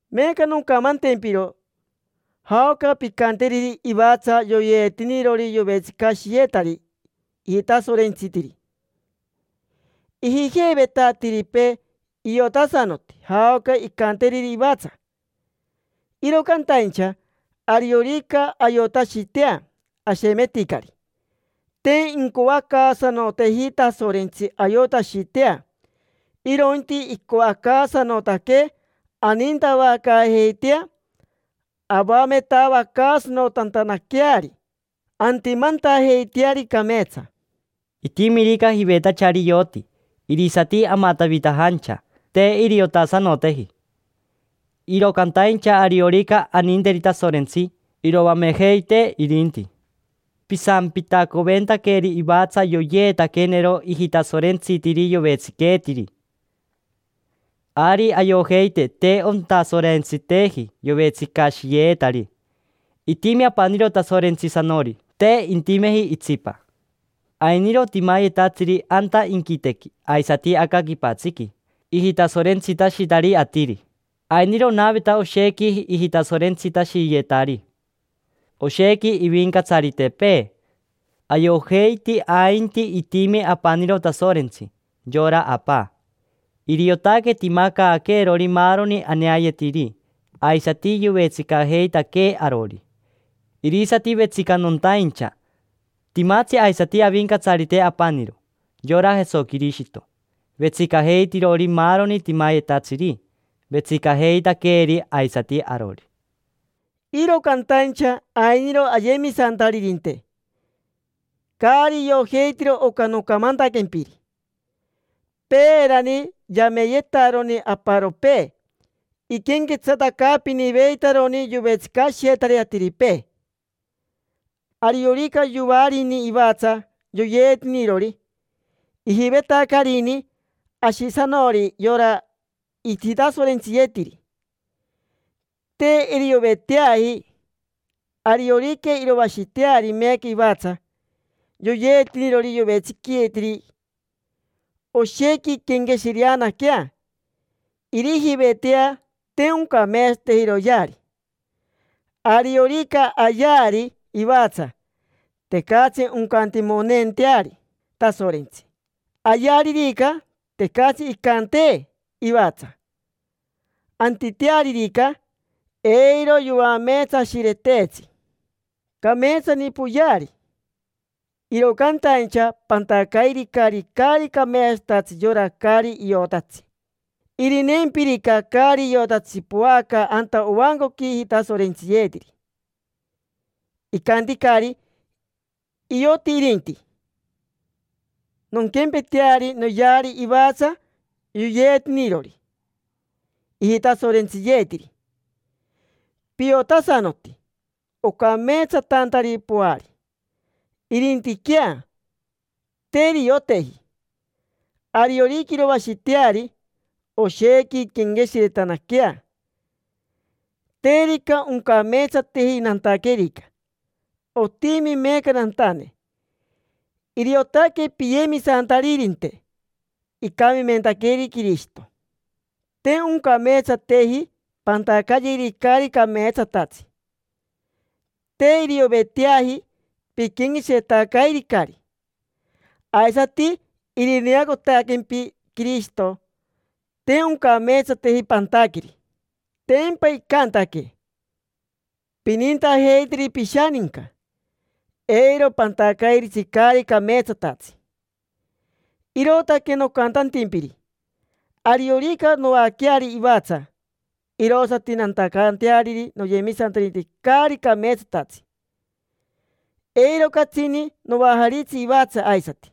Meeca noncamantempiro jaoca pincanteriri ivatsa yoyeetinirori yovetsicashiyetari ijitasorentsitiri. Ijijeiveta atiripee iotasanoti jaoca incanteriri ivatsa. Iro cantaincha, ariorica ayotashitea, ashemeticari. Te incoacaasanoteeji Tasorentsi ayotashitea, irointi icoacaasanotaquee anintavacaajeitea avametavacaasanotantanaqueari antimantajeiteari cameetsa. Itimirica jivetachari ioti, irisati amatavitajancha: te iriotasanoteji. Iro cantaincha ariorica aninteri Tasorentsi, iroamejeitee irinti. Pisampitacoventaqueri ivatsa yoyeetaquenero ijitasorentsitiri yovetsiqueetiri. Ari ayojeiti te ontasorentsiteji yovetsicashiyeetari. Itimi apaniro Tasorentsisanori, te intimeji itsipa. Ainiro timayetatsiri anta inquitequi aisati aca quipatsiqui ijitasorentsitashitari atiri. Ainiro onaveta oshequi ijitasorentsitashiyetari, oshequi ivincatsaritepee. Ayojeiti ainti itimi apaniro Tasorentsi, yora Apa. Iriotaque timacaaquerori maaroni aneayetiri, aisati yovetsicajeitaquee arori. Irisati vetsicanontaincha. Timatsi aisati Avincatsarite apaniro: yora Jesoquirishito, vetsicajeitirori maaroni timayetatsiri, vetsicajeitaqueeri aisati arori. Iro cantaincha ainiro ayemisantaririnte caari iojeitiro oca nocamantaquempiri. Peerani yameyetaroni aparopee iquenquetsatacaapiniveitaroni yovetsicashiyetari atiripee. Ariorica yoarini ivatsa yoyeetinirori, ijivetacarini ashisanori yora ijitasorentsiyeetiri. Te irioveteaji; ariorica iroashiteari meeca ivatsa yoyeetinirori yovetsiqueetiri, oshequi inquenqueshireanaquea, irijivetea te oncameetsateji iroyeari. Ariorica ayeari ivatsa, tecatsi oncantimoneenteari Tasorentsi. Ayearirica, tecatsi incantee ivatsa. Antitearirica, eiro yoameetsashireteetsi. Cameetsani poyeari, iro cantaincha pantacairicari caari cameetsatatsi yora caari iotatsi. Irineempirica caari iotatsi poaca anta ovancoqui ijitasorentsiyeetiri, icanticari: “Ioti irinti. Nonquempeteari, noyeari ivatsa yoyeetinirori ijitasorentsiyeetiri”. Piotasanoti, ocameetsatantari poari. Irintiquea, te irioteji. Ariorica iroashiteari, oshequi inquenqueshiretanaquea: “Terica oncameetsateji nantaquerica. Otimi meeca nantane”. Iriotaque piyemisantaririnte, icamimentaqueri Quirishito. Te oncameetsateji pantacayeri caari cameetsatatsi. Te irioveteaji, piquenqueshiretacairicari. Aisati irineacotaquempi Quirishito, te oncameetsateji pantaqueri. Tempa icantaquee: “Pinintajeiteri pishaninca, eiro pantacairitsi caari cameetsatatsi”. Irootaque nocantantimpiri: ariorica noaqueari ivatsa, irosati nantacanteariri noyemisantaririnte caari cameetsatatsi, eiro catsini noajaritsi ivatsa aisati.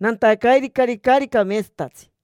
Nantacairicari caari cameetsatatsi.